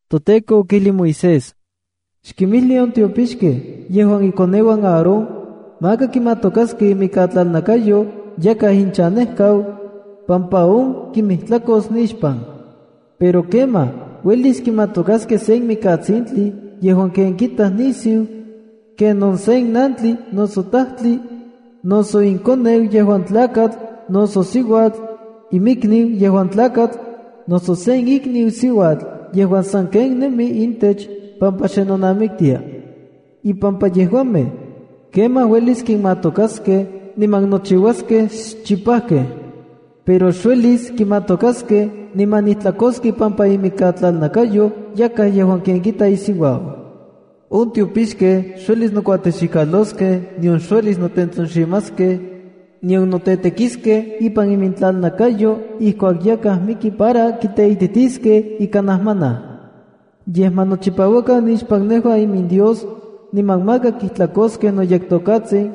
ToTEKO okijlij Moisés: “Xkinmijli on tiopixkej yejuan ikoneuan Aarón, maka kimatokaskej imikatlalnakayo yakaj ichanejkau, pampa on kinmijtlakos nixpan. Pero kemaj, uelis kimatokaskej sen mikatsintli yejuan ken kitaj nisiu, kenon sen nantli noso tajtli, noso inkoneu yejuan tlakatl, noso siuatl, inmikniu yejuan tlakatl, noso sen ikniu siuatl yejuan sanken nemi intech pampa xe nonamiktia. Impampa yejuamej, kemaj uelis kimatokaskej niman nochiua xchipauak. Pero xuelis kimatokas niman nijtlakos ipampa imikatlalnakayo yakaj yejuan ken kita isiuau. ’On tiopixkej xuelis nokuatexikaloskej, nion xuelis notentsonximaskej, nion notetekiskej ipan imintlalnakayo ijkuak yakaj miki para kiteititiskej ika najmanaj. Yej ma nochipauakan nixpan nejua iminDios, niman maka kijtlakoskej noyekTokatsin,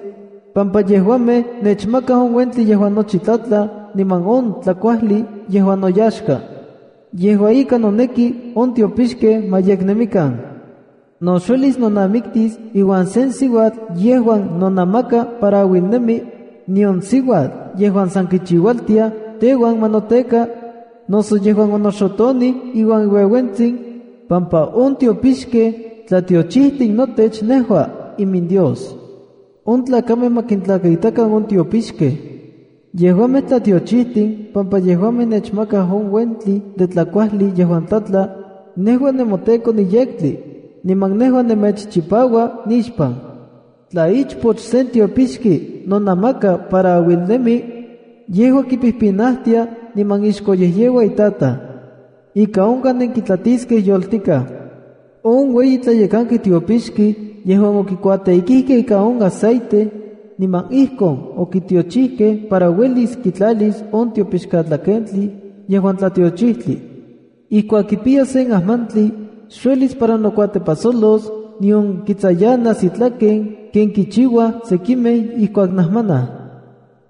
pampa yejuamej nechmakaj on uentli yejuan nochi tlatla niman on tlakuajli yejuan noyaxka. Yejua ika, noneki on tiopixkej ma yeknemikan. ’No xuelis nonamiktis iuan sen siuatl yejuan nonamaka para auilnemi, nion siuatl yejuan san kichiualtiaj teuan ma noteka, noso yejuan onoxotonij iuan iueuentsin, pampa on tiopixkej tlatiochijtin notech nejua, iminDios. On tlakamej ma kintlakaitakan on tiopixkej. Yejuamej yektlakamej pampa yejuamej nechmakaj on uentli de tlakuajli yejuan tlatla. Nejua nemoTEKO niyektli, niman nejua nemechchipaua nixpan. ’Tla ichpoch sen tiopixki nonamaka para auilnemi, yejua kipijpinajtia niman ixkoyejyeua itataj. Ika onkaj nenkitlatiskej yoltikaj. ’On ueyi tlayekanki tiopixki yejuan okikuatêkijkej ika on aceite, niman ijkon okitiochijkej para uelis kitlalis on tiopixkatlakentli yejuan tlatiochijtli. Ijkuak kipiyas sen ajmantli, xuelis para nokuatepajsolos, nion kitsayanas itlaken ken kichiuaj sekimej ijkuak najmanaj.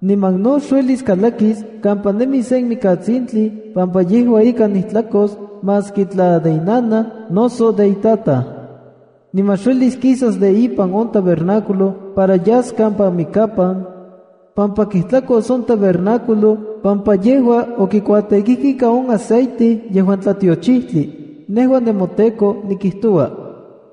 Niman no xuelis kalakis kampa nemi sen mikatsintli pampa yejua ika nijtlakos maski tla de inanaj noso de itataj. Niman xuelis kisas de ipan on tabernáculo para yas kampa mikapan, pampa kijtlakos on tabernáculo pampa yejua okikuatêkijkej ika on aceite yejuan tlatiochijtli. Nejua nemoTEKO nikijtoua.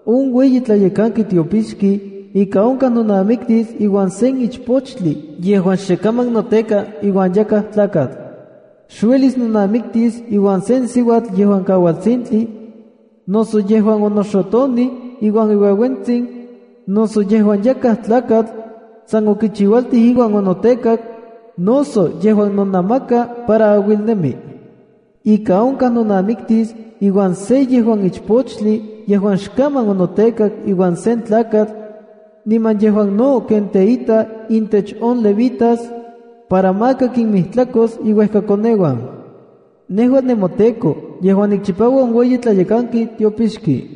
’On ueyi tlayekanki tiopixki ika onkaj nonamiktis iuan sen ichpochtli yejuan xekaman noteka iuan yakaj tlakatl. Xuelis nonamiktis iuan sen siuatl yejuan kaualtsintli, noso yejuan onoxotonij iuan iueuentsin, noso yejuan yakaj tlakatl san okichiualtij iuan onotekak, noso yejuan nonamaka para auilnemi. Ika onkaj nonamiktis iuan se yejuan ichpochtli yejuan xkaman onotekak iuan sen tlakatl, niman yejuan no ken teita intech on Levitas, para maka kinmijtlakos iuejkakoneuan. Nejua nemoTEKO yejuan nikchipaua on ueyi tlayekanki tiopixki.”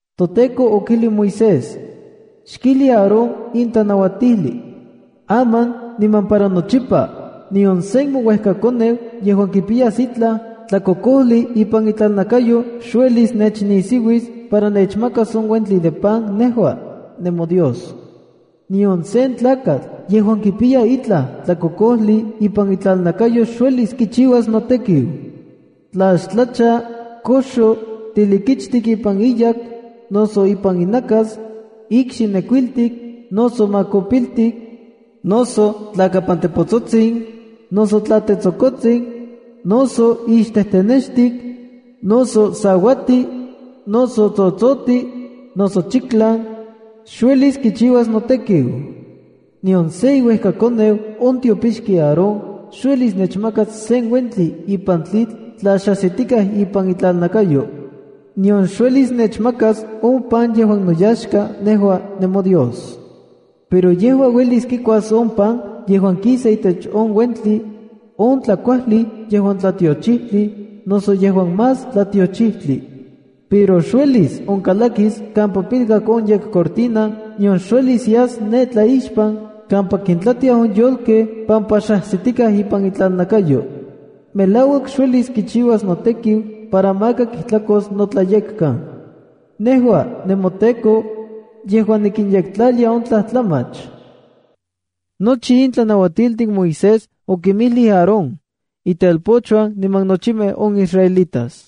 ToTEKO okijli Moisés: “Xkijli Aarón in tlanauatijli: Aman niman para nochipa, nion sen mouejkakoneu yejuan kipiyas itlaj tlakokojli ipan itlalnakayo xuelis nechnisiuis para nechmakas on uentli de pan nejua, nemoDios. Nion sen tlakatl yejuan kipiya itlaj tlakokojli ipan itlalnakayo xuelis kichiuas notekiu. Tla xtlacha, koxo, tilikichtik ipan iyak, noso ipan inakas, ikxi nekuiltik, noso makopiltik, noso tlakapantepotsotsin, noso tla tetsokotsin, noso ixtenextik, noso sauati, noso tsotsoti, noso eunuco, xuelis kichiuas notekiu. Nion se iuejkakoneu on tiopixki Aarón, xuelis nechmakas sen uentli ipan tlitl tla xajsitikaj ipan itlalnakayo. Nion xuelis nechmakas on pan yejuan noyaxka nejua nemoDios. Pero yejua uelis kikuas on pan yejuan kisa itech on uentli, on tlakuajli yejuan tlatiochijtli, noso yejuan más tlatiochijtli. Pero xuelis onkalakis kampa pilkak on yekcortina nion xuelis yas ne tlaixpan kampa kintlatiaj on yolkej pampa xajsitikaj ipan itlalnakayo. Melauak xuelis kichiuas notekiu para maka kijtlakos notlayekkan. Nejua, nemoTEKO, yejuan nikinyektlalia on tlajtlamach.” Nochi in tlanauatiltin Moisés okinmijlij Aarón, itelpochuan niman nochimej on israelitas.